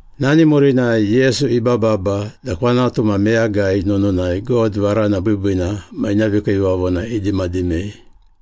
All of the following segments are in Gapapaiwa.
Nani murinai Yesu ibababa da kwanatu ma meyagai nununai God varana biibiina ma ina vikiivavona idimadimei.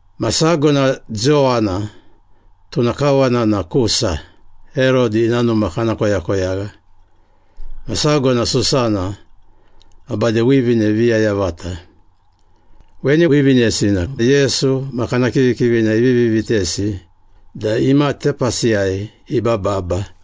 Ma sago na Jowana, tuna kawana na Kusa, Herodi ina numa kana koyakoyagha. Ma sago na Susana ma bade wivine viya yavata. Weni wivinesi na Yesu ma kana kivikivina ivivi vitesi da ima tepasiyai ibababa.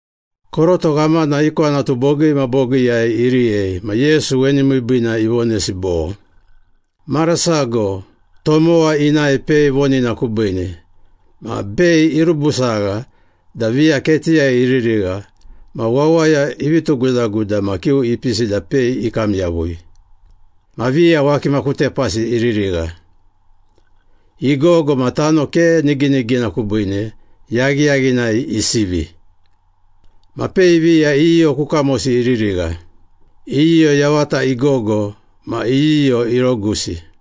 Koroto ghamana i kwanatu bogii ma bogiiyai iriyei, ma Yesu weni miibiina ivonesi bo, “Mara sago tomowa inae pei vonina kubiine. Ma pei irubusagha da viya ketiyai iririgha ma wawaya ivi tugudaguda ma kiu ipisi da pei ikam yavui. Ma viya wakima ku tepasi iririgha. Igogo ma tano ke niginigina kubiine, yaghiyaghinai isivi. Ma pei viya iyiyo ku kamosi iririgha. Iyiyo yavata igogo ma iyiyo irogusi.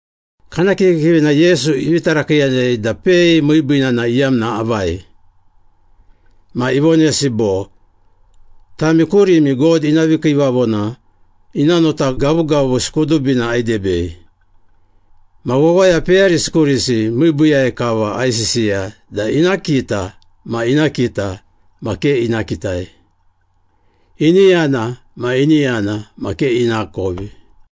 Kana kivikivina Yesu ivi tarakiiyanei da pei miibiina na iyamna avai. Ma ivonesi bo, “Tami kurimi God ina vikiivavona ina nota gavugavusi kudubina aidebei. Ma wawaya peyarisi kurisi miibiiyai kava aisisiya da ‘ina kita ma ina kita ma ke ina kitai. Ini yana ma ini yana ma ke inakovi.’”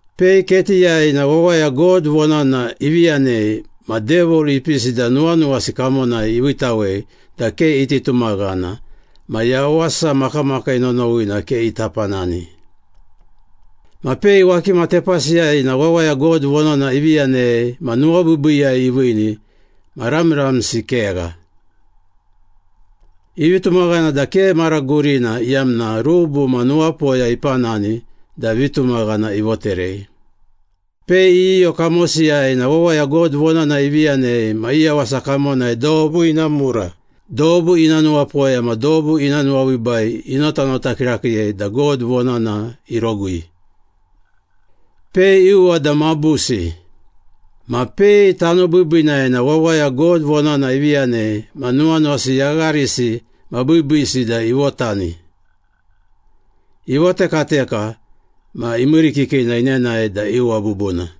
Pei ketiyai na wawaya God vonana ivi yanei ma Devil ipisi da nuwanuwasi kamonai iviitawei da ke iti tumaghana ma yawasa makamakii nonowina ke ita panani. Ma pei wakima tepasiyai na wawaya God vonana ivi yanei ma nuwabiibiiyai iviini ma ramramsi kegha. Ivi tumaghana da ke mara gurina iyamna rubu ma nuwapoya ipanani da vitumaghana ivoterei. Pei iyiyo kamosiyai na wawaya God vonana ivi yanei ma i yawasa kamonai dobu ina mura, dobu ina nuwapoya ma dobu ina nuwabiibai inotanota kirakiiyei da God vonana irogui. Pei iuwa da mabusi. Ma pei tano biibiinai na wawaya God vonana ivi yanei ma nuwanuwasi yagharisi ma biibiisi da ivotani. Ivotekateka ma imiirikikina inenae da iuwa bubuna.”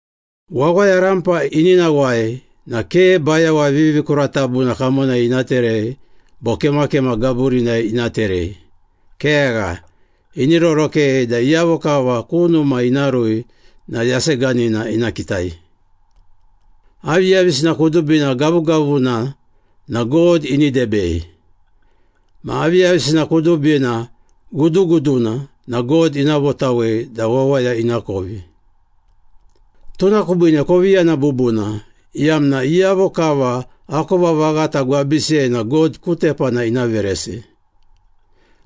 “Wawaya rampa ini nawai na ke bayawa vivikuratabuna kamonai ina terei bo kemakema gaburinai ina terei. Kegha, ini rorokei da iyavo kava ku numa ina rui na yaseganina ina kitai.” “Aviyavisina kudubina gavugavuna na God ini debei. Ma aviyavisina kudubina guduguduna na God ina votawei da wawaya inakovi.” “Tuna kubiine kovi yana bubuna, iyamna iyavo kava akova vaghata gwabisiyai na God ku tepana ina veresi.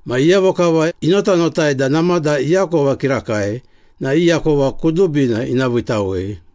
Ma iyavo kava inotanotai da namada iakova kirakai na i akova kudubina ina viitawei.”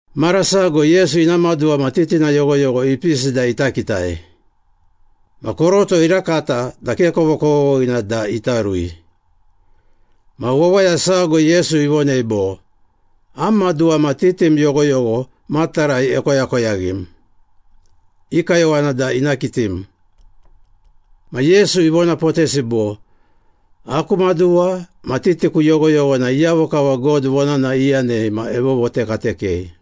Mara sago Yesu ina maduwa ma titina yoghoyogho ipisi da ita kitai. Ma koroto irakata da ke kovokovoghina da ita rui. Ma wawaya sago Yesu ivonei bo, “Am maduwa ma titim yoghoyogho matarai ekoyakoyaghim. I kayowana da ina kitim.” Ma Yesu ivonapotesi bo, “Aku maduwa ma titiku yoghoyogho na iyavo kava God vonana iyanei ma evovotekatekei.”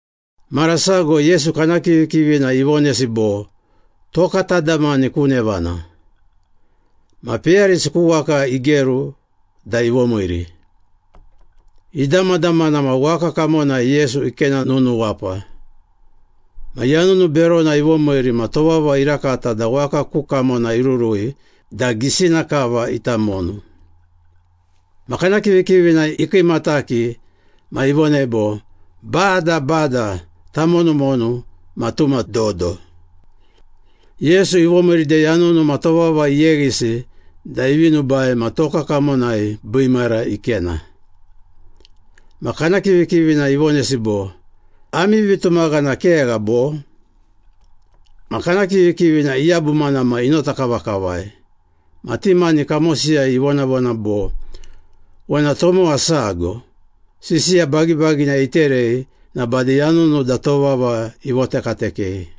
Mara sago Yesu kana kivikivina ivonesi bo, “Toka tadamani ku nevana.” Ma peyarisi ku waka igeru da ivomiiri. Idamadamana ma waka kamonai Yesu ikena nunuwapa. Ma yanunu berona ivomiiri ma tovava irakata da waka ku kamona irurui da gisina kava ita monu. Ma kana kivikivina ikiimataki ma ivonei bo, “Bada, Bada, tamonumonu ma tuma dodo!” Yesu ivomiiri da yanunu ma tovava iyeghisi da ivi nubai ma toka kamonai biimara ikena. Ma kana kivikivina ivonesi bo, “Ami vitumaghana kegha, bo?” Ma kana kivikivina iyabumana ma inota kavakavai. Ma ti mani kamosiyai ivonavona bo, “Wena tomowa sago, sisiya bagibagina iterei na bade yanunu da tovava ivotekatekei!”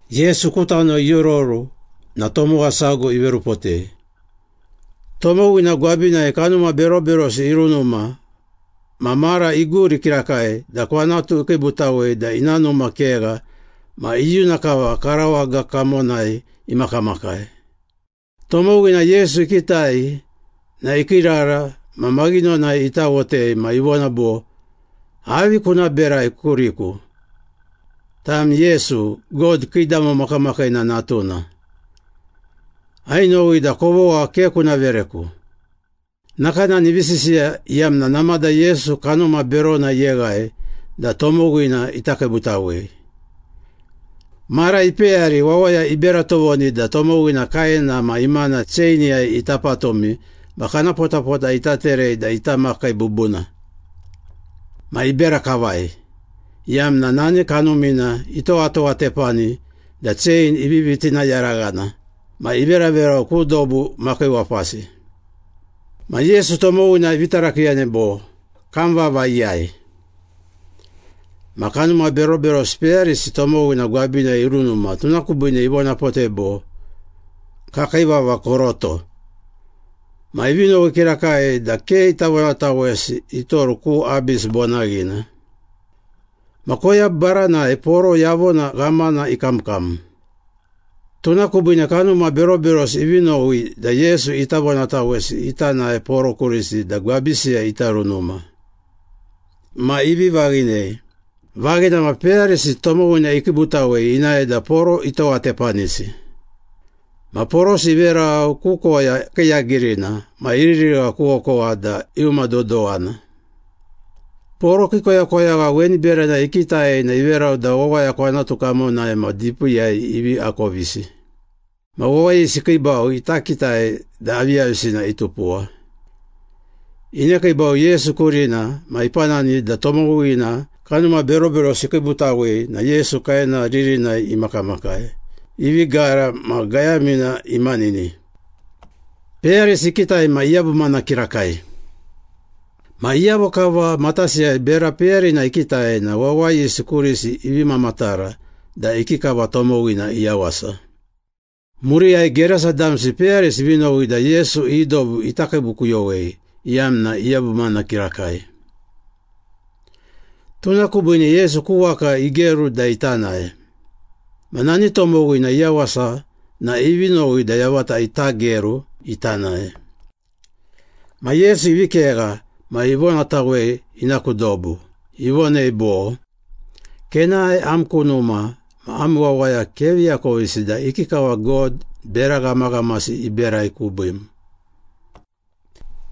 Yesu ku tano iororu na tomowa sago iverupotei. Tomowina gwabinai kanuma beroberosi irunuma ma mara iguri kirakai da kwanatu ikiibutawei da ina numa kegha ma iyuna kava karawaga kamonai imakamakai. Tomowina Yesu ikitai na ikiirara ma maghinonai itawotei ma ivona bo, “Avi kuna berai kuriku? Tam Yesu, God Kiidamo Makamakiina Natuna. Ainowi da kovogha ke kuna vereku!” Nakanani ivi sisiya, iyamna namada Yesu kanuma berona iyeghai da tomowina ita kiibutawei. Mara ipeyari wawaya ibera tovoni da tomowina kaena ma imana cheiniyai ita patumi ma kana potapota ita terei da ita makai bubuna. Ma ibera kavai, iyamna nani kanumina itowatowatepani da chein ivivi tinayaraghana ma iveraverau ku dobu makiiwapasi. Ma Yesu tomowina ivi tarakiiyanei bo, “Kam vava iyai?” Ma kanuma beroberosi peyarisi tomowina gwabinai irunuma, tuna kubiine ivonapotei bo, “Kakii vava Koroto.” Ma ivi nowi kirakai da ke ita vonatawesi itoru ku Abis bonaghina. Ma koya baranai poro yavona ghamana ikamkam. Tuna kubiine kanuma beroberosi ivi nowi da Yesu ita vonatawesi ita nae poro kurisi da gwabisiyai ita runuma. Ma ivi vaghinei. Vaghina ma peyarisi tomowina ikiibutawei inae da poro itowatepanisi. Ma porosi iverau ku koya kiiyagirina ma iririgha ku okowa da iumadodowana. Poro kii koyakoyagha weni berana ikitai na iverau da wawaya kwanatu kamonai ma dipiiyai ivi akovisi. Ma wawayisi ikiibau ita kitai da aviyavisina itupuwa. Inekiibau Yesu kurina ma ipanani da tomowina kanuma beroberosi ikiibutawei na Yesu kaena ririnai imakamakai, ivi gara ma gayamina imanini. Peyarisi ikitai ma iyabumana kirakai. Ma iyavo kava matasiyai bera peyarina ikitai na wawayisi kurisi ivi mamatara da ikikava tomowina iyawasa. Muriyai Gerasa damsi peyarisi ivi nowi da Yesu i dobu ita kiibukuyowei iyamna iyabumana kirakai. Tuna kubiine Yesu ku waka igeru da ita nae. Ma nani tomowina iyawasa na ivi nowi da yavata ita geru ita nae. Ma Yesu ivi kegha ma ivonatawei ina ku dobu. Ivonei bo, “Kenae am ku numa ma am wawaya kevi akovisi da ikikava God bera ghamaghamasi iberai kubiim.”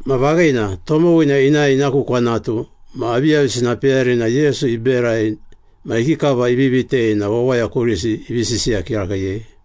Ma vaghina, tomowina inae ina ku kwanatu ma aviyavisina peyarina Yesu iberai ma ikikava ivi vitei na wawaya kurisi ivi sisiya kirakiiyei.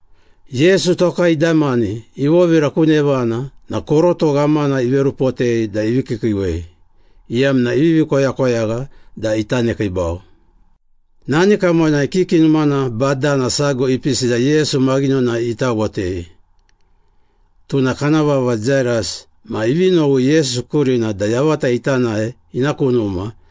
Yesu toka idamani, ivovira ku nevana na koroto ghamana iverupotei da ivi kiikiiwei, iyamna ivivi koyakoyagha da ita nekiibau. Nani kamonai kiki numana badana sago ipisi da Yesu maghinonai itawotei. Tuna kana vava Jairas ma ivi nowi Yesu kurina da yavata ita nae ina ku numa,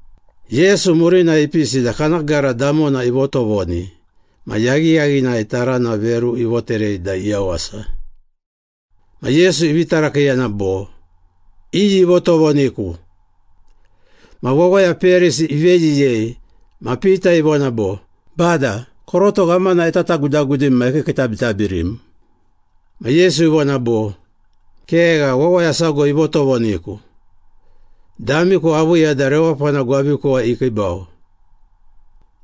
Yesu murinai ipisi da kana gara damona ivotovoni ma yaghiyaghinai tarana veru ivoterei da iyawasa. Ma Yesu ivi tarakiiyana bo, “Iyi ivotovoniku?” Ma wawaya peyarisi iveyiyei, ma Pita ivona bo, “Bada, koroto ghamana etatagudagudim ma ekiikiitabitabirim.” Ma Yesu ivona bo, “Kegha, wawaya sago ivotovoniku. Damiku aviiya da rewapana gwabikuwai ikiibau.”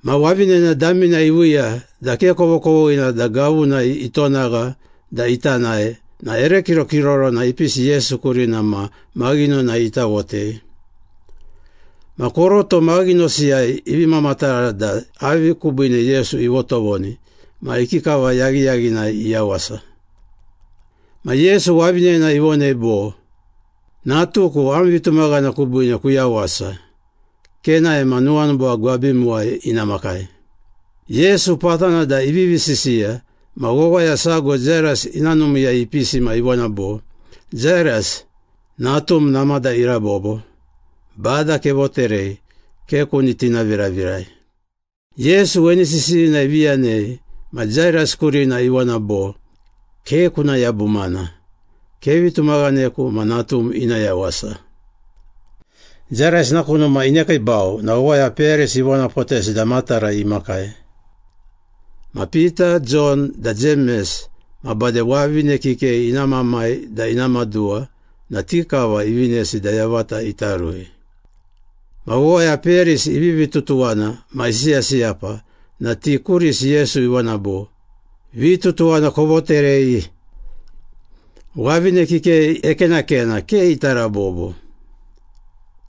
Ma wavinena damina iviiya da ke kovokovoghina da gavunai itonagha da ita nae na ere kirokirorona ipisi Yesu kurina ma maghinonai itawotei. Ma koroto maghinosiyai ivi mamatara da avi kubiine Yesu ivotovoni ma ikikava yaghiyaghinai iyawasa. Ma Yesu wavinena ivonei bo, “Natuku, am vitumaghana kubiine kuyawasa. Kenae ma nuwanuba gwabimuwai ina makai.” Yesu patana da ivivi sisiya ma wawaya sago Jairas ina numiiyai ipisi ma ivona bo, “Jairas, natum namada irabobo. Bada kevoterei, ke kuni tinaviravirai.” Yesu weni sisiyina ivi yanei ma Jairas kurina ivona bo, “Ke kuna yabumana. Kevi tumaghaneku ma natum ina yawasa.” Jairas ina ku numa inekiibau na wawaya peyarisi ivonapotesi da matarai imakai. Ma Pita, Jon da Jemes, ma bade wavine kikei ina mamai da ina maduwa na ti kava ivinesi da yavata ita rui. Ma wawaya peyarisi ivivi tutuwana ma isiyasiyapa na ti kurisi Yesu ivona bo, “Vitutuwana kovoterei. Wavine kikei ekenakena, ke ita rabobo.”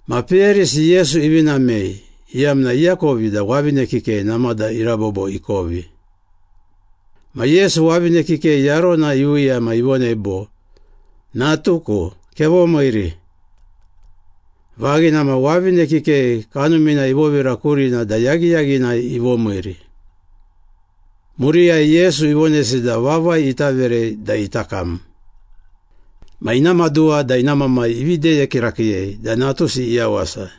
Ma peyarisi Yesu ivi namei, iyamna iakovi da wavine kikei namada irabobo ikovi. Ma Yesu wavine kikei yarona iviiya ma ivonei bo, “Natuku, kevomiiri.” Vaghina ma, wavine kikei kanumina ivovira kurina da yaghiyaghinai ivomiiri. Muriyai Yesu ivonesi da vavai ita verei da ita kam. Ma ina maduwa da ina mamai ivi deye kirakiiyei da natusi iyawasa.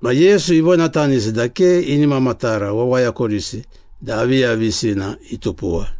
Ma Yesu ivonatanisi da ke ini mamatara wawaya kurisi da aviyavisina itupuwa.